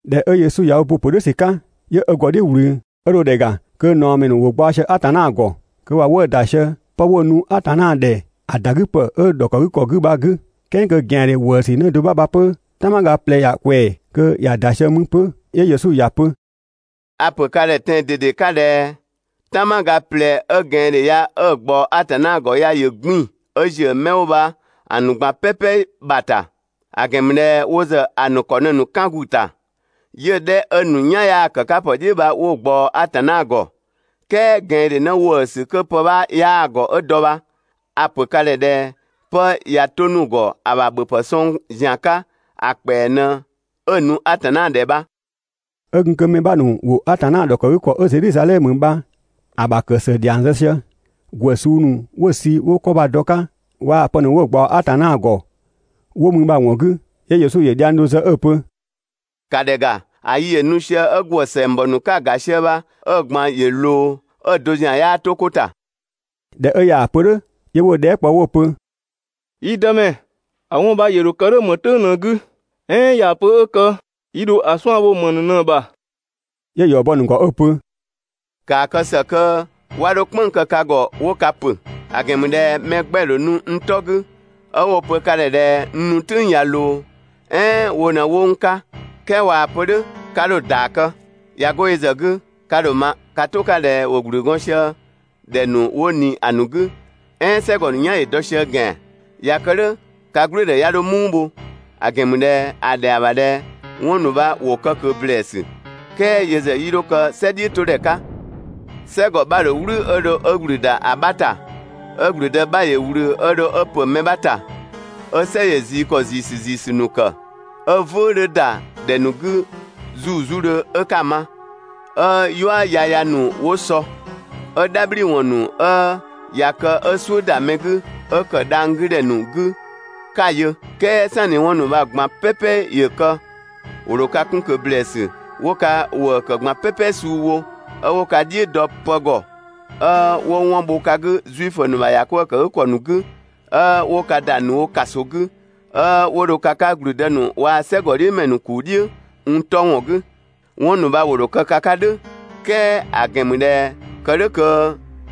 ꞊Dhɛ 'ö Yesu ‑yö ö bo ‑a ‑pö "dhʋ̈ ‑sü 'ka, 'yö ö ‑gɔ "dhiʋ̈ ꞊wlü. 'Ö dho ‑dhɛ ‑ga kö ꞊naɔmɛ ‑nu ‑wo gbaɔ sië Atanna ‑gɔ, kö ‑wa 'wëë‑ ‑da sië 'pë 'wo‑ nu Atanna ‑dhɛ ‑a ‑da 'gü ‑pë 'ö‑ ‑dhɔkëgükɔ 'gü bha‑ 'gü. "Kɛɛ kö ꞊gɛandhe ‑wëësü 'në do 'bha bha 'pö "tanmaga ꞊plɛ ‑ya ꞊kwɛɛ‑, kö ‑ya ‑da sië mü 'pö. 'Yö Yesu ‑ya pö: «A‑ ‑pö ka ‑dhɛ tɛan‑ ꞊dede 'ka ꞊dhɛ "tanmaga ꞊plɛ 'ö ꞊gɛandhe ya 'ö‑ ꞊gbaɔ Atanna ‑gɔ ya, ‑yö 'gbiin‑ 'ö ‑ziö mɛ 'wo bha‑ ‑nu ꞊gban "pɛpɛ ‑bha ‑ta. ‑A ‑gɛn ‑mü ꞊dhɛ wo ‑zë ‑a ‑nu ‑kɔ ꞊në‑ ‑nu 'kën ‑gu ‑ta, 'yö‑ 'dhɛ 'ö‑ ‑nu "yan 'yaa ‑kë 'ka ‑pë "dhiʋ̈ bha 'wo‑ ꞊gbaɔ Atanna ‑gɔ, "kɛɛ ꞊gɛandhe 'në ‑wëësü 'kö pë 'bhaa‑ ‑gɔ 'ö dɔ bha, a‑ ‑pö ka ‑dhɛ ꞊dhɛ 'pë ꞊ya 'to‑ 'nu‑ ‑gɔ ‑a ‑bha ‑bhöpë sɔng ‑zian 'ka ‑a ‑kpɛa ꞊në 'ö‑ nu Atanna ‑dhɛ bha. 'Ö gun kö mɛ 'bha ‑nu ‑wo Atanna ‑dhɔkëgükɔ 'ö Zedhizadhɛmö bha‑ ‑kë ‑së ‑dhiang zë sië, ‑gwë suu ‑nu 'wo‑ sü 'wo 'kɔ bha‑ dɔ‑ 'ka waa‑ pë ‑nu 'wo‑ ꞊gbaɔ Atanna ‑gɔ 'wo mü bha‑ ‑wɔn 'gü, 'yö Yesu ‑yö dhiang do zë 'ö‑ pö: «‑Ka ‑dhɛ ‑ga, ‑a yi ‑yö nu sië 'ö ‑gwë ‑sɛngbɔ ‑nu 'ka‑ ‑ga sië bha, 'ö‑ ꞊gban ‑yö ꞊loo, 'ö‑ do ‑zian 'yaa 'to 'ko ‑ta.» ꞊Dhɛ 'ö ꞊yaa‑ pö "dhʋ̈, 'yö 'wo‑ dhɛɛ" kpɔ 'wo‑ pö: «Yi Dëmɛ, ‑a 'wɔn bha ‑yö ‑dho kë "dhʋ̈ ‑më "tʋ̈ng ꞊në‑ 'gü? "Ɛɛn ꞊yaa‑ pö 'ö kë yi ‑dho ‑a 'suan‑ bho ‑më ‑nu ꞊në‑ ‑bha?» 'Yö‑ ‑yɔ bɔ‑ ‑nu ‑gɔ 'ö‑ pö: «‑Kaa kë ‑së kö 'wa 'dho "kpënng‑ kë ka ‑gɔ 'wo ka ‑pö; ‑a ‑gɛn ‑mü ꞊dhɛ mɛ 'gbɛ‑ ‑dho nu n 'tɔ 'gü, 'ö 'wo‑ pö ka ‑dhɛ ꞊dhɛ n nu "tʋ̈ng ꞊ya ꞊loo, "ɛɛn wo ꞊në 'wo n 'ka, "kɛɛ ꞊waa‑ pö "dhʋ̈, 'ka 'dho‑ ‑yɔ bɔ. ꞊Ya 'go yö ‑zë 'gü, ka ‑dho ‑a ma ka "tʋ 'ka ꞊dhɛ ‑wo ‑gblü gɔɔn sië ‑dhɛ ‑nu 'wo ꞊ni ‑a ‑nu 'gü, "ɛɛn "sɛgɔ ‑nu "yan ‑yö dɔ sië ‑gɛan. ꞊Ya kë "dhʋ̈ ka "gblʋ̈ʋ̈dhɛ 'ya 'dho "muu bho, ‑a ‑gɛn ‑mü ꞊dhɛ ‑a ‑dhɛa ‑bha ꞊dhɛ 'wɔn ‑nu bha ‑wo kë ꞊kö ‑blɛɛsü. "Kɛɛ yö ‑zë 'yii 'dho kë "sɛ "dhiʋ̈todhɛ 'ka.» "Sɛgɔ 'bha‑ ‑dho "wlü 'ö dho ö ‑gblü ‑da ‑a 'bha ‑ta, 'ö ‑gblüdë 'bha ‑yö ꞊wlü 'ö dho 'ö ‑pö mɛ 'bha ‑ta. 'Ö "sɛ ‑yö ꞊zii ‑kɔ ‑ziisü ‑ziisü ‑nu ‑kë, 'ö "vʋ̈ʋ̈ 'dhö ‑da ‑dhɛ ‑nu 'gü 'zuuzudhö 'ö 'ka‑ ma, 'ö "yua yaya ‑nu 'wo sɔ. 'Ö "dhabhliwɔn ‑nu 'ö ꞊ya kë 'ö "suʋ̈ ‑da mɛ 'gü 'ö ‑kë dhang‑ 'gü ‑dhɛ ‑nu 'gü 'ka‑ yö. "Kɛɛ "sanni 'wɔn ‑nu bha‑ ꞊gban "pɛpɛ ‑yö kë, ‑wo ‑dho ka 'kun ꞊kö ‑blɛɛsü 'wo ka ‑wëë ‑kë ꞊gban "pɛpɛ suu wo, 'ö wo ka "dhiʋ̈ dɔ pë ‑gɔ, 'ö 'wo 'wɔn bho ka 'gü Zuifö ‑nu ‑bha ‑yakwëëkëgükɔ ‑nu 'gü, 'ö 'wo ka ‑da ‑nu wo ‑kaso 'gü, 'ö 'wo dho ka 'ka ‑gblüdë ‑nu waa‑ "sɛgɔdhiʋ̈mɛ ‑nu ‑kuu "dhiʋ̈ n 'tɔ ‑wɔn 'gü. 'Wɔn ‑nu bha ‑wo ‑dho kë ka 'ka "dhʋ̈, "kɛɛ ‑a ‑gɛn ‑mü ꞊dhɛ kë "dhʋ̈ kö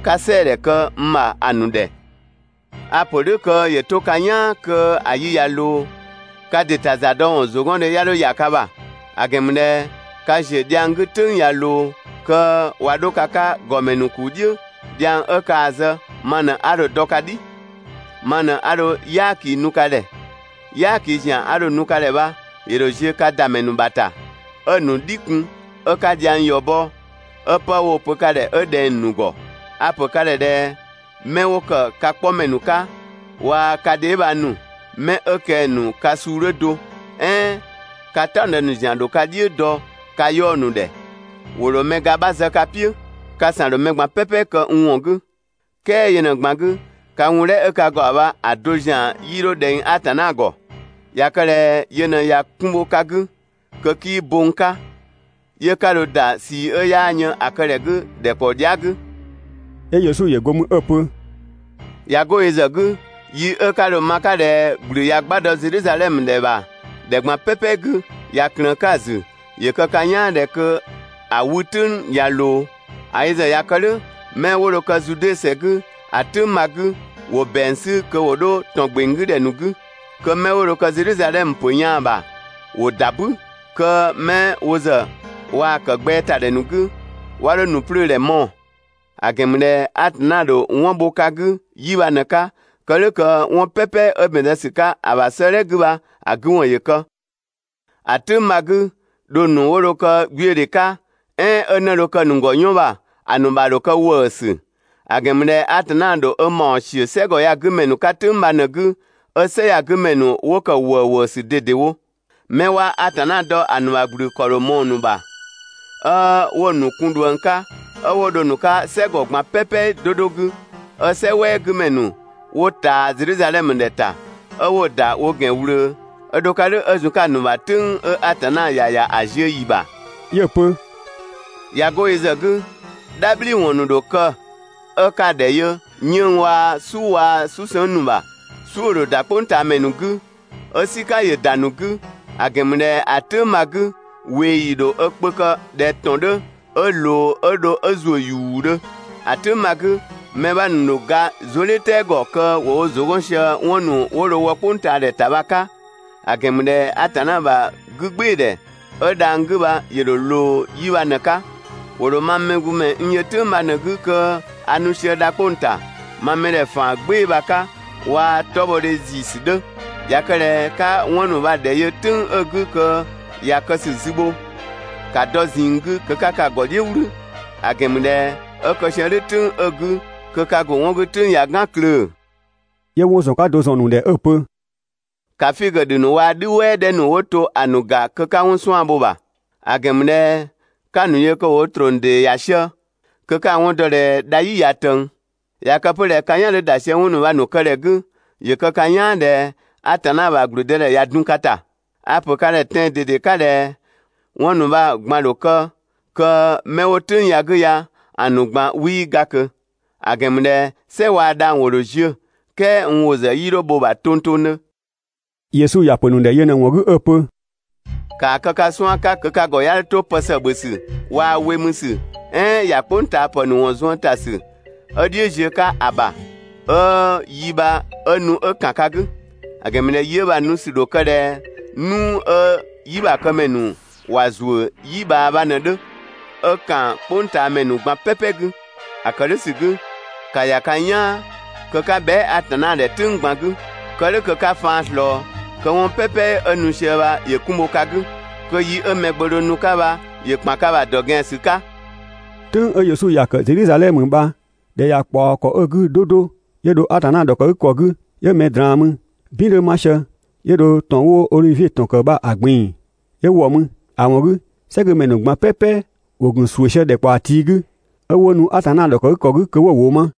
'ka "sɛɛdhɛ kë n ‑bha ‑a ‑nu ‑dhɛ. A‑ ‑pö "dhʋ̈ kö ‑yö 'to ka "yaan kö ‑a yi ꞊ya ꞊loo kö ka ‑dɩ ‑ta ‑za dɔ ‑wɔn ‑zʋgɔndhe 'ya 'dho ‑ya ka ‑bha, ‑a ‑gɛn ‑mü ꞊dhɛ ka ‑ziö dhiang 'gü "tʋ̈ng ꞊ya ꞊loo kö ꞊wa 'dho ka 'ka ‑gɔmɛ ‑nu ‑kuu "dhiʋ̈ (dhiang 'ö kaa‑ zë ma ꞊në 'a dho‑ dɔ ka "dhi). Ma ꞊në 'a dho "yaaki nu ka ‑dhɛ. "Yaaki ‑zian 'a dho‑ nu ka ‑dhɛ bha, ‑yö ‑dho ziö ka ‑da ‑mɛ ‑nu ‑bha ‑ta, 'ö‑ ‑nu "dhi kun 'ö 'ka dhiang ‑yɔ bɔ, 'ö 'pë woo‑ pö ka ‑dhɛ 'ö ꞊dhɛng‑ ‑nu ‑gɔ. A‑ ‑pö ka ‑dhɛ ꞊dhɛ 'mɛ 'wo ‑kë ka 'kpɔmɛ ‑nu 'ka waa‑ ka dheebhang ‑nu, 'mɛ 'ö kɛng‑ ‑nu ka suu 'dhö do, "ɛɛn ka "taɔngdë ‑nu ‑zian ‑dho ka "dhiʋ̈ dɔ ka 'yaɔ‑ ‑nu ‑dhɛ. ‑Wo ‑dho mɛ ga 'bha zë ka "piʋ̈. Ka ‑san ‑dho mɛ ꞊gban "pɛpɛ kë n ‑wɔn 'gü, "kɛɛ yö ꞊në‑ ꞊gban 'gü, ka wun "dhɛ 'ö ka ‑gɔ ‑bha bha‑ do ‑zian 'yii 'dho ꞊dhɛng Atanna ‑gɔ. ꞊Ya kë ꞊dhɛ yö ꞊në ꞊ya 'kun bho ka 'gü, kö 'kii bo n 'ka, 'yö 'ka dho ‑da ꞊sii 'ö yaa yën ‑a kë ‑dhɛ 'gü ‑dhɛkpaɔ dhia" 'gü.» 'Yö Yesu ‑yö go mü 'ö‑ pö: «꞊Ya 'go yö ‑zë 'gü, yi 'ö 'ka dho‑ ma‑ 'ka ꞊dhɛ ‑gblü ꞊ya 'gba dɔ Zedhizadhɛmö ‑dhɛ ‑bha ‑dhɛ ꞊gban "pɛpɛ 'gü ꞊ya ꞊klëën‑ 'ka‑ ‑zü, ‑yö kë ka "yaan ꞊dhɛ kö ‑a 'wü "tʋ̈ng ꞊ya ꞊loo. ‑A yö ‑zë ꞊ya kë "dhʋ̈, 'mɛ 'wo dho kë Zude ‑sɛ 'gü ‑a "tʋ̈ng bha‑ 'gü, ‑wo ‑bɛang sü kö ‑wo 'dho ‑tɔn ‑gbeng 'gü ‑dhɛ ‑nu 'gü. Kö 'mɛ 'wo Zedhizadhɛmö ‑pö yaan‑ ‑bha ‑wo ‑da "bü, kö 'mɛ 'ö wo ‑zë waa‑ ‑kë gbɛɛ ‑ta ‑dhɛ ‑nu 'gü, 'wa 'dho ‑nu 'plöödhɛ mɔɔ‑. ‑A ‑gɛn ‑mü ꞊dhɛ Atanna ‑dho 'wɔn bho ka 'gü 'yi bha ꞊në‑ 'ka, kë "dhʋ̈ kö 'wɔn "pɛpɛ 'ö ‑bɛn zë ‑sü 'ka‑ ‑bha 'sëëdhɛ 'gü bha‑ 'gü ‑wɔn ‑yö kë. ‑A "tʋ̈ng bha‑ 'gü, dhong ‑nu 'wo dho kë 'gbiödhe 'ka, "ɛɛn 'ö 'në dho kë‑ ‑nu ‑gɔ "yɔn ‑bha, ‑a ‑nu ‑bha ‑dho kë ‑wëësü; ‑a ‑gɛn ‑mü ꞊dhɛ Atanna ‑dho ö ‑mawɔn ‑siö "sɛgɔ ya‑ 'gü mɛ ‑nu 'ka "tʋ̈ng bha ꞊në‑ 'gü, 'ö "sɛ ya‑ 'gü ‑mɛ ‑nu 'wo ‑kë ‑wëëwëësü ꞊dedewo. 'Mɛ 'waa Atanna dɔ ‑a ‑nu ‑bha ‑gblü ‑kɔ ‑dho ꞊mɔɔ‑ ‑nu ‑bha, 'ö 'wo‑ ‑nu kun ꞊dhuëng 'ka, 'ö 'wo dho nu‑ 'ka "sɛgɔ ꞊gban "pɛpɛ 'do 'do 'gü, 'ö "sɛ "wɛɛ 'gü ‑mɛ ‑nu 'wo ꞊taa Zedhizadhɛmö ‑dhɛ ‑ta, 'ö 'wo‑ ‑da wo ‑gɛn ꞊wlöö 'ö dho‑ 'ka "dhʋ̈ 'ö zun‑ 'ka‑ ‑nu ‑bha "tʋ̈ng 'ö Atanna ‑ya ‑ya ‑a ziö ‑yi ‑bha.» ꞊Ya 'go yö ‑zë 'gü, "dhabhliwɔn ‑dho kë 'ö 'ka‑ ‑dhɛ yö 'yënng‑ waa‑ "su waa‑ "susëngga ‑nu ‑bha. "Suʋ̈‑ ‑dho ‑da "kpʋngtaamɛ ‑nu 'gü, 'ö "sika ‑yö ‑da ‑nu 'gü, ‑a ‑gɛn ‑mü ꞊dhɛ ‑a "tʋ̈ng bha‑ 'gü, ꞊weeyi ‑dho ö kpö kë ꞊dhɛ ‑tɔn 'dhö 'ö ꞊loo 'ö dho 'ö ‑zuö ‑yuudhö. ‑A "tʋ̈ng bha‑ 'gü, mɛ 'bha ‑nu ‑dho ga zuëdhiʋ̈tɛɛ ‑gɔ kö ‑wo wo ‑zʋ 'gɔn sië 'wɔn ‑nu 'wo dho wɔ "kpʋngtaadhɛ ‑ta bha‑ 'ka, ‑a ‑gɛn ‑mü ꞊dhɛ Atanna ‑bha 'gügbɩɩdhɛ 'ö dhang‑ 'gü bha ‑yö ‑dho ꞊loo 'yi bha ꞊në‑ 'ka. ‑Wo ‑dho mang Mɛgbömɛ n yö "tʋ̈ng bha ꞊në‑ 'gü kö a nu sië dha 'kpong‑ ‑ta ma mɛdhɛ ‑faan "gbɩɩ‑ bha‑ 'ka waa‑ 'tɔbhɔdhe ‑ziisü 'dhö. ꞊Ya kë ꞊dhɛ 'ka 'wɔn ‑nu bha‑ ‑dhɛ yö "tʋ̈ng 'ö‑ 'gü kö ꞊ya kë ‑sü ‑zü bho, ‑ka dɔ ꞊zinng 'gü kö 'ka ka ‑gɔ "dhiʋ̈ "wlü, ‑a ‑gɛn ‑mü ꞊dhɛ 'ö kë sië "dhʋ̈ "tʋ̈ng 'ö‑ 'gü kö ka ‑bho 'wɔn 'gü "tʋ̈ng ꞊ya "gan klöö‑.» 'Yö 'wɔn ‑zɔn 'ka do ‑zɔn ‑a ‑nu ‑dhɛ 'ö‑ pö: «‑Ka figö ‑dhü ‑nu waa‑ "dhü "wɛɛ 'dhɛ ‑nu 'wo to ‑a ‑nu ‑ga kö 'ka 'wɔn 'suan‑ bho‑ ‑bha:. ‑a ‑gɛn ‑mü ꞊dhɛ 'ka‑ ‑nu yö kö ‑wo wo ‑trɔng ‑dee ‑ya sië, kö 'ka‑ 'wɔn dɔ ꞊dhɛ dha "yi ꞊ya ꞊tëng. ꞊Ya kë 'pö ꞊dhɛ ka "yan 'dhö ‑da sië 'wɔn ‑nu bha‑ ‑nu kë ‑dhɛ 'gü, ‑yö kë ka "yaan ꞊dhɛ Atanna ‑bha ‑gblüdëdhɛ ‑ya dun ka ‑ta. A‑ ‑pö ka ‑dhɛ tɛan‑ ꞊dede 'ka ꞊dhɛ: 'Wɔn ‑nu bha‑ ꞊gban ‑dho kë kö 'mɛ 'wo "tʋ̈ng ya‑ 'gü ya‑ ‑nu ꞊gban 'wii ga ꞊kö. ‑A ‑gɛn ‑mü ꞊dhɛ "sɛ waa‑ dhang‑ ‑wo ‑dho ziö, "kɛɛ n ‑wʋ ‑zë 'yii 'dho bho‑ ‑bha tongtongdhö.» Yesu ‑ya ‑pö ‑nu ‑dhɛ yö ꞊në‑ ‑wɔn 'gü 'ö‑ pö: «‑Kaa kë ka 'suan‑ 'ka kö ka ‑gɔ 'ya 'dho 'to pë ‑së ‑bhö ‑sü waa‑ we mü ‑sü "ɛɛn ‑ya "kpʋngtaapë ‑nu ‑wɔn zuën ‑ta ‑sü 'ö "dhiʋ̈ ziö 'ka‑ ‑bha, 'ö yi bha 'ö nu 'ö ‑kan ka 'gü; ‑a ‑gɛn ‑mü ꞊dhɛ yi 'ö bha‑ nu ‑sü ‑dho kë ꞊dhɛ "nuu 'ö "yibhakëmɛ ‑nu ‑wa ‑zuö "yi ꞊bhaa bha ꞊në‑ 'dhö 'ö ‑kan "kpʋngtaamɛ ꞊gban "pɛpɛ 'gü. ‑A ‑kë "dhʋ̈ ‑sü 'gü, ‑ka ‑ya ka "yaan kö 'ka bhɛa" Atanna ‑dhɛ "tʋ̈ng ꞊gban 'gü, kë "dhʋ̈ kö 'ka faan ꞊slɔɔ, kö 'wɔn "pɛpɛ 'ö nu sië bha ‑yö 'kun bho ka 'gü, kö yi 'ö Mɛgbömɛ dho nu‑ 'ka bha ‑yö ‑kpan ka ‑bha ‑dɔ ‑gɛan ‑sü 'ka.» "Tʋ̈ng 'ö Yesu ‑ya ‑kë Zedhizadhɛmö bha ‑dhɛ ‑ya ꞊kpaɔ ‑kɔ 'ö‑ 'gü 'do 'do 'yö dho Atanna ‑dhɔkëgükɔ 'gü, 'yö mɛ ꞊draan mü, "bin 'dhö 'ma sië, 'yö dho ‑tɔn 'wo Odhivie ‑tɔn ‑kë bha‑ ꞊gbin‑ 'yö ‑wɔ mü. ‑A ‑wɔn 'gü, "sɛgümɛ ‑nu ꞊gban "pɛpɛ ‑wo ‑gun ‑suʋ̈ sië ‑dhɛkpaɔ tii' 'gü, 'ö 'wo nu Atanna ‑dhɔkëgükɔ 'gü kö 'wo‑ ‑wʋ ma.